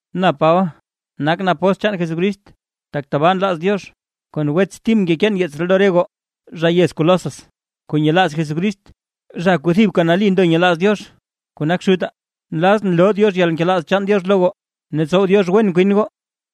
Na Paba, nakʼn apóstl chaan Jesucrist, tak tabaa nlaaz Diox. Kon wets Tim ngekeen yeets ree lo re goo zha yez Colosas kuu nyelaaz Jesucrist, zha kuu thibka nali ndo nyelaaz Diox kuu nak Xutaa. Nlazʼn loo Diox yalnkelaaz chaan Diox lo goo, ne tsow Diox wen kwin goo.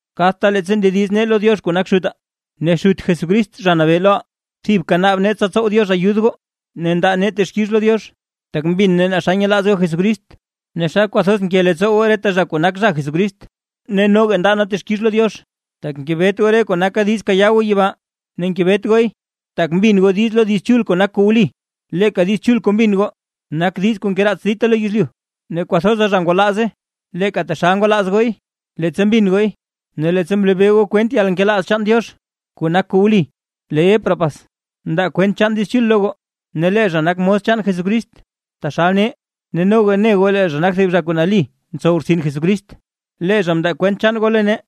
Kadta leettsa ndediz nee lo Diox kuu nak Xutaa ne Xut Jesucrist Zha Nabee loʼaa, thibka naab nee tsa tsow Diox ayud goo, ne ndaa nee texkix lo Diox, tak mbin nee naa xa nyelaaz goo Jesucrist, ne xa kwathoz nke leettsoo goo reta zha kuu nak zha Jesucrist. Ne noga ndaa nee texkix lo Diox, tak ngebet goo re kuu naka diiz kayaa goo yibaa. Ne ngebet gooy, tak mbin goo diiz lo Diiz Chul kuu nak kuu wli. Leeka Diiz Chul kuu mbin goo, nak Diiz kuu ngeraats dita lo yezlyu, ne kwathoza zha ngwalaaze, leeka taxal ngwalaaz gooy, leettsa mbin gooy ne leettsa mlebee goo kwent chaan yalnkelaaz chaan Diox kuu nak kuu wli. Lee Epafras mndaa kwent chaan Diiz Chul lo goo, lee zha nak mos chaan Jesucrist taxal nee ne noga ne goo lee zha nak thib zha kuu nali ntsow rtsin Jesucrist. Lee zha mndaa kwent chaan goo lo nee,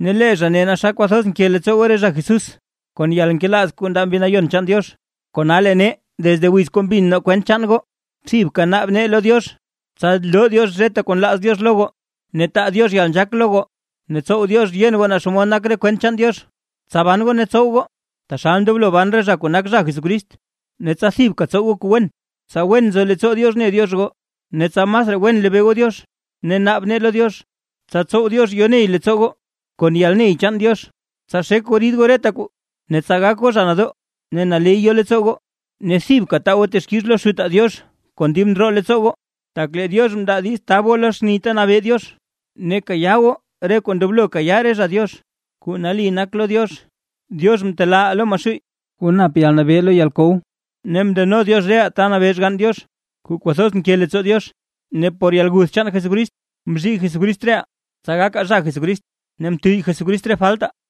ne lee zha ne naa xa kwathoz nke leettsoo goo re zha Jesús, kon yalnkelaaz kuu ndaa Mbi Nayon chaan Diox. Kona lee nee desde wiz kuu mbin nee kwent chaan goo, thibka naab nee lo Diox tsa loo Diox reta kuu nlaaz Diox lo goo, ne taa Diox yalnzhaak lo goo ne tsow Diox yen goo naa xomod nak re kwent chaan Diox. Tsa ban goo ne tsow goo, taxal ndoblo ban re zha kuu nak zha Jesucrist ne tsa thibka tsow goo kuu wen, tsa wen nzo leettsoo Diox ne Diox goo, ne tsa masraa wen lebee goo Diox. Ne naab nee lo Diox, tsa tsow Diox yoney leettsoo goo kon yalney chaan Diox, tsa xek goo rid goo reta kuu, ne tsa gak goo zha nadoo, ne naley yo leettsoo goo, ne thibka taa goo texkix lo Xutaa Diox kon dib ndroo leettsoo goo, tak lee Diox mndaa diiz tab goo lo xni ta nabee Diox, ne kayaa goo re kuu ndoblo kayaa re zha Diox kuu nali nak lo Diox. Diox mtelaaʼaa lo Maxuuy kuu nap yalnabee lo yalkow, ne mndeno Diox reʼaa ta nabee Xgann Diox kuu kwathoz nke leettsoo Diox. Ne por yalguth chaan Jesucrist mzhii Jesucrist reʼaa, tsa gakaa zha Jesucrist, ne mtuyy Jesucrist re faltaa.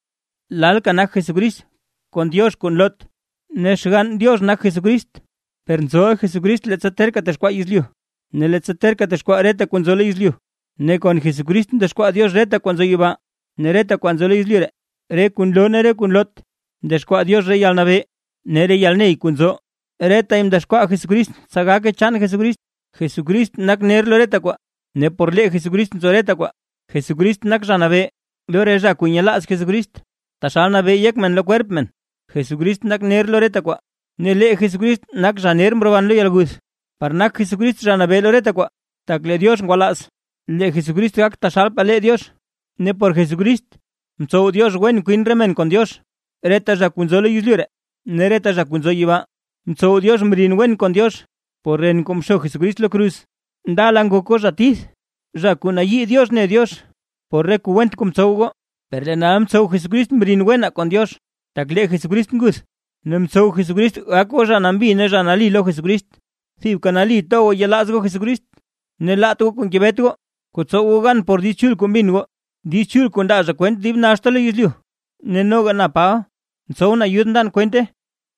Lalka nak Jesucrist kon Diox kuu nloot ne Xgann Diox nak Jesucrist, per nzoʼa Jesucrist leettsa terka texkwaa yezlyu ne leettsa terka texkwaa reta kuu nzo lo yezlyu. Ne kon Jesucrist mdexkwaa Diox reta kwaa nzo yibaa ne reta kwaa nzo lo yezlyu ree, re kuu nloo ne kuu nloot. Mdexkwaa Diox re yalnabee ne re yalney kuu nzo, retay mdexkwaa Jesucrist tsa gake chaan Jesucrist. Jesucrist nak ner lo reta kwaa, ne por lee Jesucrist nzo reta kwaa. Jesucrist nak Zha Nabee lo re zha kuu nyelaaz Jesucrist, taxal nabee yek men lo kwerp men. Jesucrist nak ner lo reta kwaa, ne lee Jesucrist nak zha ner mroban lo yalguth, par nak Jesucrist Zha Nabee lo reta kwaa. Tak lee Diox ngwalaaz lee Jesucrist gak taxalpaa lee Diox, ne por Jesucrist, mtsow Diox wen kwin re men kon Diox; reta zha nzo lo yezlyu ree ne reta zha nzo yibaa, mtsow Diox mrin wen zha kon Diox por ren kuu mxo Jesucrist lo kruz. Ndala ngok goo zha tith ne zha kuu nayii Diox ne Diox, por re kuu went kuu mtsow goo; per lee nal mtsow Jesucrist mrin wenaa kon Diox, tak lee Jesucrist nguth. Ne mtsow Jesucrist gak goo zha nambi ne zha nali lo Jesucrist. Thibka nali ndoblo to goo yelaaz goo Jesucrist, ne laat goo kuu ngebet goo, kuu tsow goo gan por Diiz Chul kuu mbin goo. Diiz kuu ndaa zha kwent dib naxta lo yezlyu, ne noga na Paba ntsowʼn ayud ndan kwente.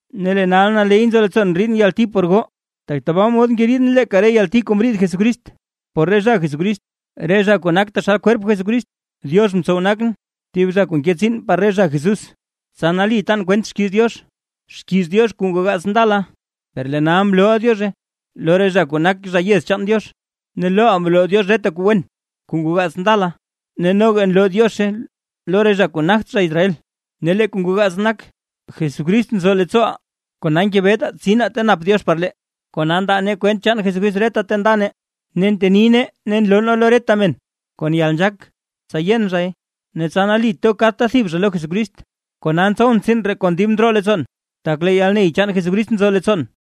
Ne lee nal naley nzo leettsoon ndriidʼn yalti por goo, tak tabaa mod ngeriidʼn leeka re yalti kuu mriid Jesucrist por re zha Jesucrist, re zha kuu nak taxal kwerp Jesucrist. Diox mtsow nakʼn thib zha kuu nke tsiin par re zha Jesús, tsa nali tan kwent xkiiz Diox. Xkiiz Diox kuu ngoo gaats ndala, per lee nal mlooʼa Diozhe lo re zha kuu nak zha yez chaan Diox. Ne loʼaa mloo Diox reta kuu wen kuu ngoo gaats ndala, ne noga nloo Diozhe lo re zha kuu nagt zha Israel. Ne lee kuu ngoo gaats nak: Jesucrist nzo leettsooʼaa, kona ngebetaa tsinaa ta nap Diox par lee. Kona ndaa nee kwent chaan Jesucrist reta ta nda nee, ne nteni nee ne nloo nee lo reta men kon yalnzhaak tsa yen zhay, ne tsa nali to kadta thib zha lo Jesucrist. Kona ntsowʼn tsiin ree kon dib ndroo leettsoon, tak lee yalney chaan Jesucrist nzo leettsoon.